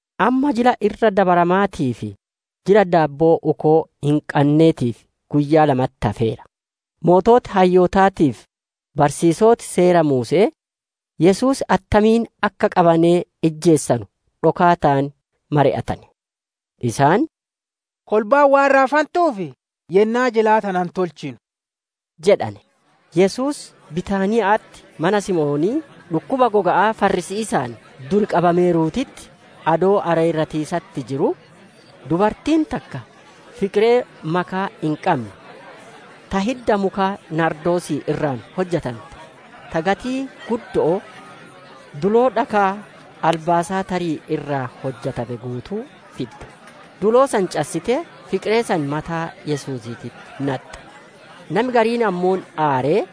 Amma, Jila Irra Dabaramaatii fi Jila Daabboo Uukoo Hin Qanneetiif guyyaa lamatti hafeera. Sooreyyiin hayyootaatii fi barsiisoti Seera Muuse'ee Yesuus attamiin akka qabanee ijjeesanu dhokaataan mari'atane. Isaan, «Kolbaan waan raafantuuf yennaa jilaa tana hin tolchinu» jedhane. Yesuus Bitaaniya'atti mana Simoonii dhukkuba goga'aa farrisiisa'aan dur qabameeruutitti adoo areerratiisatti jiruu, dubartiin takka fiqiree makaa hin qanne ta hidda muka naardoosii irraa hujante, ta gatii guddo'oo, duloo dhakaa albaasaaxarii irraa hujame guutuu fidde; duloo san cassitee fiqiree san mataa Yesuusiititti naxxe. Nami gariin ammoo aaree,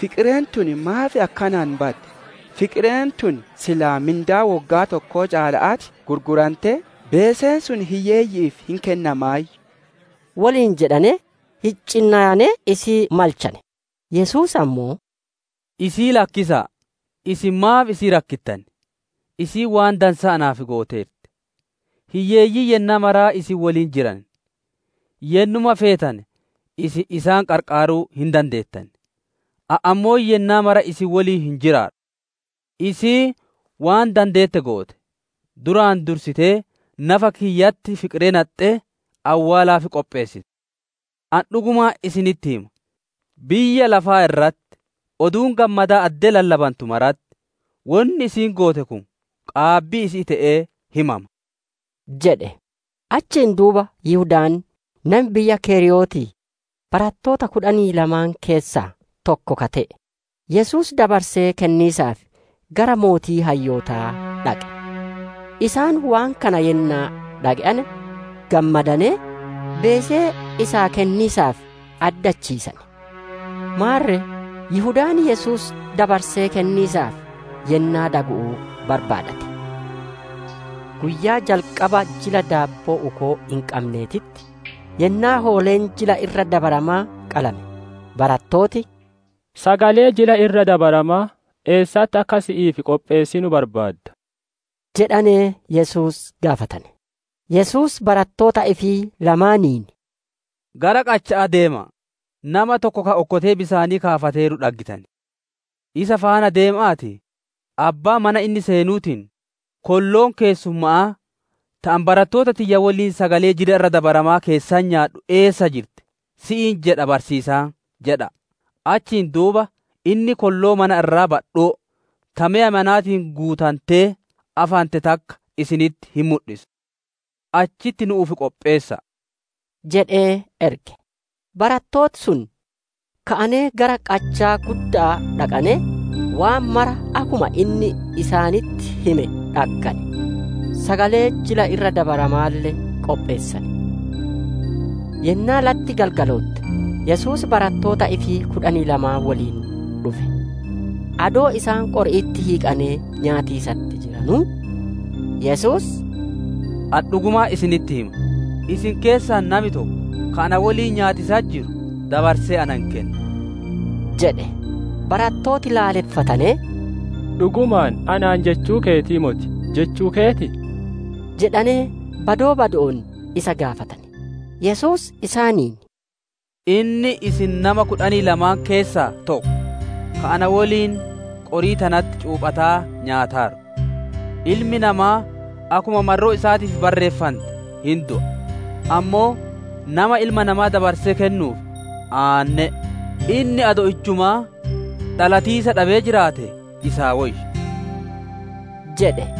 «Fiqireen tun maaf akkanaan baddi? Fiqireen tun silaa mindaa woggaa tokkoo caala'atti gurgurantee, beeseen sun hiyyeeyyi'iif hin kennamaayyu» woliin jedhanee, hincinnayanee isii malchane. Yesuus ammoo, «Isii lakkisa'a! Isin maaf isii rakkittan? Isiin waan dansaa naaf gooteerti. Hiyyeeyyiin yennaa maraa isiniin woliin jiran; yennuma feetane isin isaan qarqaaruu hin dandeettan. Ani ammoo yennaa mara isin woliin hin jiraadhu. Isiin waan dandeette goote; duraan dursitee nafa kiyyatti fiqiree naxxee awwaalaaf qopheessite. Ani dhugumaan isinitti hima, biyyaa lafaa irratti Oduun Gammadaa addee lallabantu maratti wonni isiin goote kun qaabbii isi'ii te'ee himama» jedhe. Achiin duuba Yihudaan nami biyya Keriyootii barattoota kudhanii lamaan keessaa tokko ka te'e, Yesuus dabarsee kenniisaaf gara sooreyyii hayyootaa dhaqe. Isaan waan kana yennaa dhage'ane, gammadanee, beesee isaa kenniisaaf addachiisane. Maarre Yihudaan Yesuus dabarsee kenniisaaf yennaa dagu'uu barbaadate. Guyyaa jalqaba Jila Daabboo Uukoo Hin Qanneetitti, yennaa hooleen Jila Irra Dabaramaa qalame, barattooti, «Sagalee Jila Irra Dabaramaa eessatti akka si'iif qopheessinu barbaadda?» jedhanee Yesuus gaafatane. Yesuus barattoota ifii lamaaniin, «Gara qacha'aa deema'a! Nama tokko ka okkotee bisaanii kaafateeru dhaggitan. Isa faana deema'aatii, abbaa mana inni seenuutiin, ‹Kolloon keessumma'aa ta ani barattoota tiyya woliin sagalee Jila Irra Dabaramaa keessatti nyaadhu eessa jirti? Si'iin jedha barsiisaan› jedha'a. Achiin duuba inni kolloo mana irraa badhoo, ta meya manaatiin guutantee afante takka isinitti hin mudhisa. Achitti nu'uuf qopheessa'a» jedhee erge. Barattooti sun ka'anee gara qachaa gudda'aa dhaqanee, waan maraa akkuma inni isaanitti hime dhaggane; sagalee Jila Irra Dabaramaalle qopheessane. Yennaa latti galgalootte Yesuus barattoota ifii kudhanii lamaan woliin dhufe. Adoo isaan qori'itti hiiqanee nyaatiisatti jiranuu, Yesuus, «Ani dhugumaan isinitti hima; isin keessaa nami tokko, ka na woliin nyaatiisatti jiru dabarsee ana hin kenna» jedhe. Barattooti laaleffatanee, «Dhugumaan anaan jechuu keetii moti! Jechuu keetii?» jedhanee badoo bado'oon isa gaafatane. Yesuus isaaniin, «Inni isin nama kudhanii lamaan keessaa tokko, ka na woliin qorii tanatti cuuphataa nyaataaru. Ilmi namaa akkuma marroo isaatiif barreeffante hin du'a; ammoo nama Ilma Namaa dabarsee kennuuf aanne'e! Inni adoo ijjumaa dhalatiisa dhabee jiraatee isaa woyya!» jedhe.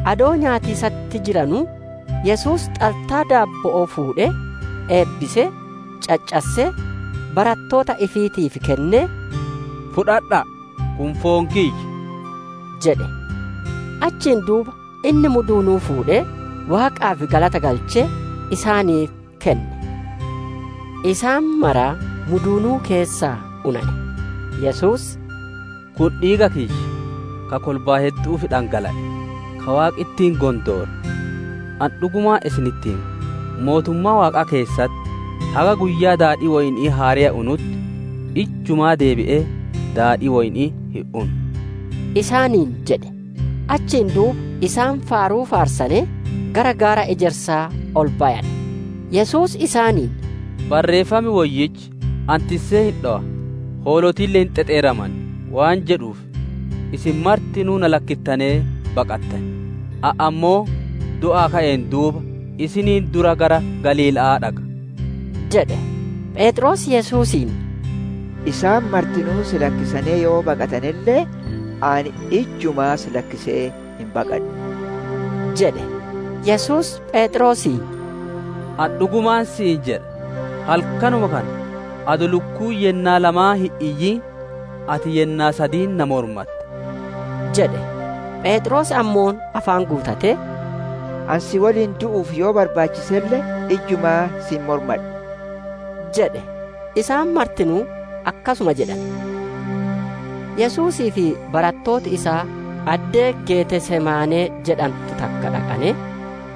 Adoo nyaatiisatti jiranuu, Yesuus xaltaa daabbo'oo fuudhee, eebbisee, caccassee, barattoota ifiitiif kennee, «Fudhadha'a; kun foon kiyya!» jedhe. Achiin duuba Inni muduunuu fuudhee, Waaqaaf galata galchee, isaaniif kenne; isaan maraa muduunuu keessaa unane. Yesuus «Kun dhiiga kiyya, ka kolbaa heddu'uuf dhangala'e, ka Waaqi ittiin gondoore. Ani dhugumaan isinitti hima; mootummaa Waaqaa keessaatitti haga guyyaa daadhii Woyni'ii haareya unutti ijjumaa deebi'ee daadhii Woyni'ii hin unu» isaaniin jedhe. Achiin duuba isaan faaruu faarsanee, gara gaara ejersaa ol bayane. Yesuus isaaniin, «Barreeffam Woyyichi, ‹Ani tissee hin dhowa; hoolotille hin xexeeraman›, waan jedhuuf isin martinuu na lakkittanee hin baqattan. Ani ammoo du'aa ka'een duuba isiniin dura gara Galiila'aa dhaqa» jedhe. Pheexroos Yesuusiin, «Isaan martinuu si lakkisanee yoo baqatanelle ani ijjumaa si lakkisee hin baqadhu!» jedhe. Yesuus Pheexroosiin, «Ani dhugumaan si'iin jedha; halkanuma kana adoo lukkuun yennaa lamaan hin iyyin ati yennaa sadiin na mormatta» jedhe. Pheexroos ammoo afaan guutatee «Ani si woliin du'uuf yoo barbaachiselle, ijjumaa si hin mormadhu» jedhe. Isaan martinuu akkasuma jedhane. Yesuusii fi barattooti isaa addee Getesemaanee jedhantu takka dhaqanee,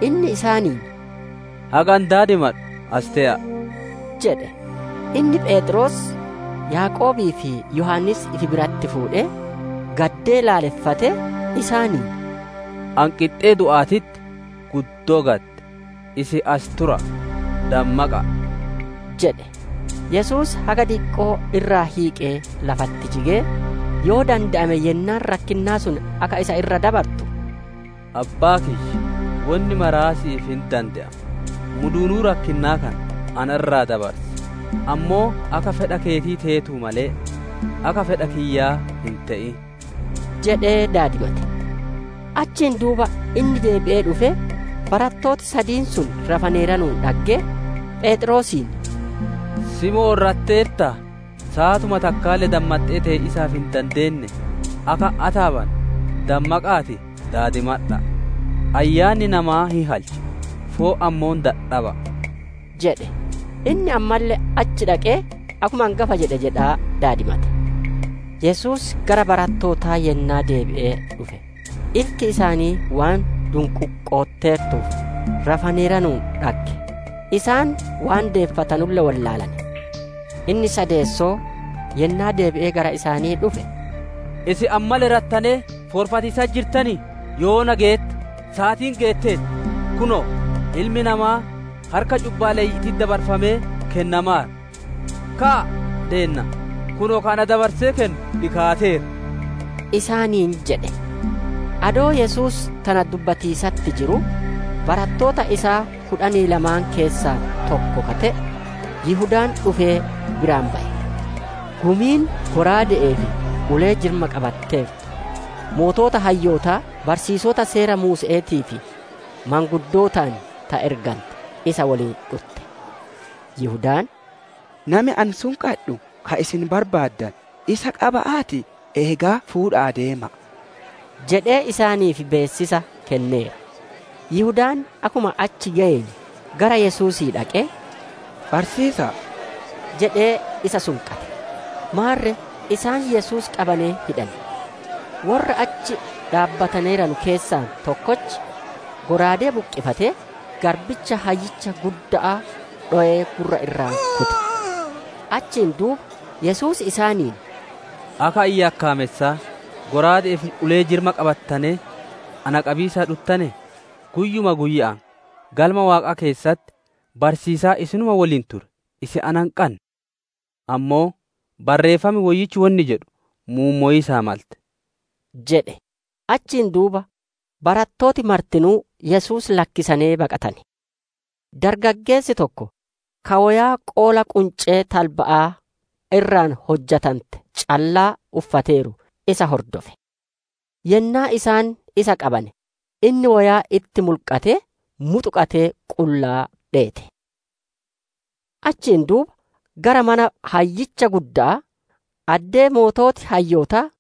inni isaaniin «Haga Ani daadimadhu asi tee'a'a» jedhe. Inni Pheexroos, Yaaqoobii fi Yohaannis ifi biratti fuudhee, gaddee laaleffatee, isaaniin, «Ani qixxee du'aatitti guddoo gadde. Isin as tura'a; dammaqa'a» jedhe. Yesuus haga diqqoo irraa hiiqee lafatti jigee, yoo dande'ame yennaan rakkinnaa sun akka isa irra dabartu, «Abbaa kiyya wonni mara si'iif hin dande'ama; muduunuu rakkinnaa kana na irraa dabarsi! Ammoo akka fedha keetii teetuu malee, akka fedha kiyyaa hin te'in» jedhee daadimate. Achiin duuba inni deebi'ee dhufee, barattooti sadiin sun rafaneeranuun dhaggee, Pheexroosiin, «Simoon rateertaa? Saatuma takkaalle dammaxxee tee'iisaaf hin dandeennee? Akka hin ataabanne, dammaqa'aatii daadimadha'a! Ayyaanni namaa hin halcha; foon ammoo dadhaba'a» jedhe. Inni ammalle achi dhaqee, akkuma angafa jedhe jedhaa daadimate. Yesuus gara barattootaa yennaa deebi'ee dhufe, ilti isaanii waan dunquuqotteertuuf rafaneeranuun dhagge; isaan waan deeffatanulle wollaalane. Inni sadeessoo, yennaa deebi'ee gara isaanii dhufe, «Isin ammalle rattanee foorfatiisatti jirtanii? Yoona geette! Saatiin geetteerti! Kunoo, Ilmi namaa harka cubbaaleyyi'iititti dabarfamee kennamaara. Ka'aa, deemnaa! Kunoo ka ana dabarsee kennu dhikaateera» isaaniin jedhe. Adoo Yesuus tana dubbatiisatti jiruu, barattoota isaa kudhanii lamaan keessaa tokko ka te'e Yihudaan dhufee biraan baye. Gumiin shallaaga'aa fi ulee-jirma qabatteertu, sooreyyii hayyootaa, barsiisota Seera Muuse'eetii fi maanguddootaan ta ergante isa woliin dhutte. Yihudaan, «Nami ani sunqadhu ka isin barbaaddanu. Isa qaba'aatii eegaa fuudha'aa deema'a» jedhee isaaniif beessisa kenneera. Yihudaan akkuma achi geyeen, gara Yesuusii dhaqee, «Barsiisa'a!» jedhee isa sunqate. Maarre isaan Yesuus qabanee hidhane. Worra achi dhaabbataneeranu keessaa tokkochi shallaagaa buqqifatee, garbicha hayyicha gudda'aa dhowee, gurra irraa kute. Achiin duuba Yesuus isaaniin, «Akka ani yakkaamessaa shallaaga'aa fi ulee-jirma qabattanee na qabiisaaf dhuttanee? Guyyuma guyya'aan Galma Waaqaa keessatti barsiisaa isinuma woliin ture; isin na hin qanne. Ammoo Barreeffam Woyyichi wonni jedhu mummowiisaa malte» jedhe. Achiin duuba barattooti martinuu Yesuus lakkisanee baqatane. Dargaggeessi tokko, ka woyaa qoola quncee talba'aa irraa hujante callaa uffateeru isa hordofe. Yennaa isaan isa qabane, inni woyaa itti mulqatee, muxuqatee qullaa dheete. Achiin duuba gara mana hayyicha gudda'aa, addee sooreyyiin hayyootaa,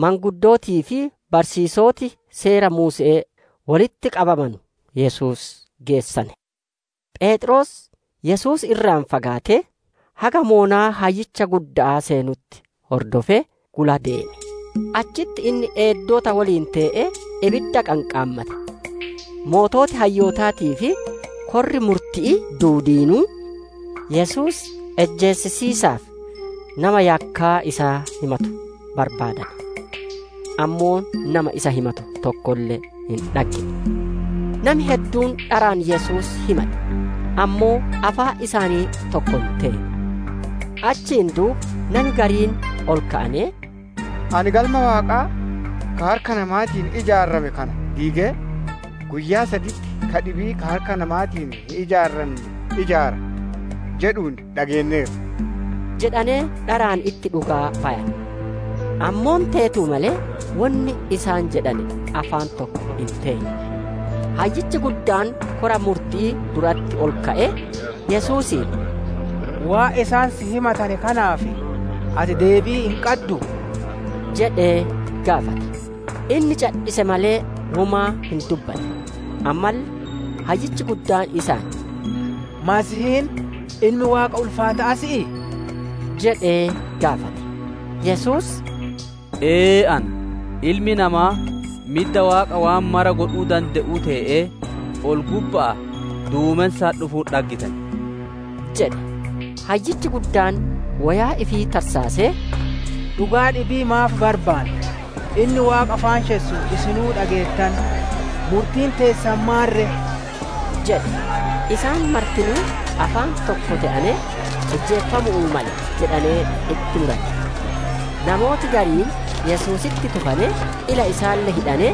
maanguddootii fi barsiisoti Seera Muuse'ee wolitti qabamanu Yesuus geessane. Pheexroos Yesuus irraa fagaatee, haga badhinna dalleya hayyicha gudda'aa seenutti hordofee, gula deeme. Achitti inni eeddota woliin tee'ee, ibidda qanqaammate. Sooreyyiin hayyootaatii fi korri murti'ii duudiinuu, Yesuus ijjeesisiisaaf, nama yakkaa isaa himatu barbaadane. Ammoo nama isa himatu tokkolle hin dhaggine. Nami hedduun dharaan Yesuus himate; ammoo afaan isaanii tokko hin teene. Achiin duuba nami gariin ol ka'anee, « ‹Ani Galma Waaqaa ka harka namaatiin ijaarame kana diigee, guyyaa saditti ka dhibii ka harka namaatiin hin ijaaranne ijaara›, jedhuun dhageenneerra» jedhanee dharaan itti dhugaa bayane. Ammoo teetuu malee wonni isaan jedhane afaan tokko hin teene. Hayyichi guddaan kora murti'ii duratti ol ka'ee, Yesuusiin, «Waan isaan si himatane kanaaf ati deebii hin qadduu?» jedhee gaafate. Inni cadhise malee womaa hin dubbanne. Ammalle hayyichi guddaan isaan, «Masiihiin, Ilmi Waaqa ulfaata'aa si'ii?» jedhee gaafate. Yesuus, «Ee ana; Ilmi namaa midda Waaqaa waan mara godhuu dande'u tee'ee ol-gubba'aa duumensaan dhufuun hin dhaggitan» jedhe. Hayyichi guddaan woyaa ifii tarsaasee, «Dhugaa dhibii maaf barbaanna? Inni Waaqa faanshessuun isinuu dhageettane. Murtiin teessan maan ree?» jedhe. Isaan martinuu afaan tokko te'anee, ijjeefamu'uu male jedhanee itti murane. Namooti gariin Yesuusitti tufanee, ila isaalle hidhanee,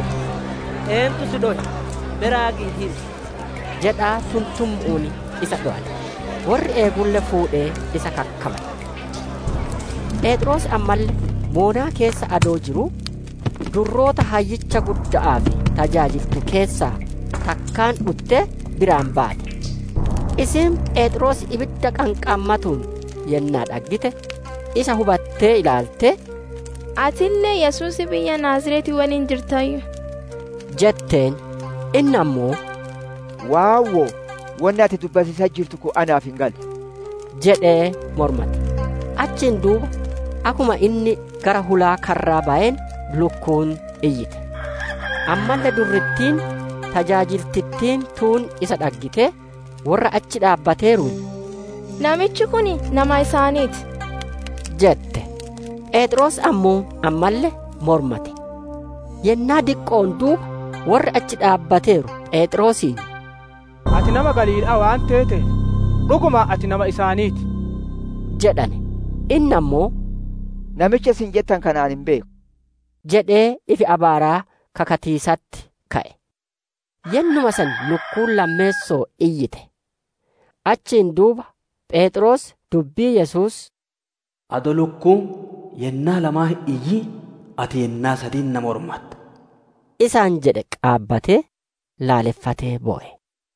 «Eentu si dhowe? Me raagii himi» jedhaa tuntummu'uun isa dhowane. Worri eegulle fuudhee isa kakkabale. Pheexroos ammalle badhinna dalleyaa keessa adoo jiruu, durroota hayyicha gudda'aaf tajaajiltu keessaa takkaan dhuttee biraan baate. Isiin Pheexroos ibidda qanqaammatuun yennaa dhaggite, isa hubattee ilaaltee, «Atille Yesuusii biyya Naaziretii woliin jirtaayyu» jetteen. Inni ammoo, «Waawwo'o! Wonni ati dubbatiisatti jirtu kun naaf hin galu» jedhee mormate. Achiin duuba akkuma inni gara hulaa karraa bayeen lukkuun iyyite. Ammalle durrittiin tajaajiltittiin tuun isa dhaggitee worra achi dhaabbateeruun, «Namichi kun nama isaanii ti!» jette. Pheexroos ammoo ammalle mormate. Yennaa diqqo'oon duuba worri achi dhaabbateeru Pheexroosiin, «Ati nama Galiila'aa waan teeteef, dhugumaan ati nama isaanii ti» jedhane. Inni ammoo, «Namicha isin jettanu kana ani hin beeku» jedhee ifi abaaraa kakatiisatti ka'e. Yennuma san lukkuun lammeessoo iyyite. Achiin duuba Pheexroos dubbii Yesuus, «Adoo lukkuun yennaa lamaan hin iyyin ati yennaa sadiin na mormatta» isaan jedhe qaabatee, laallefatee bowe.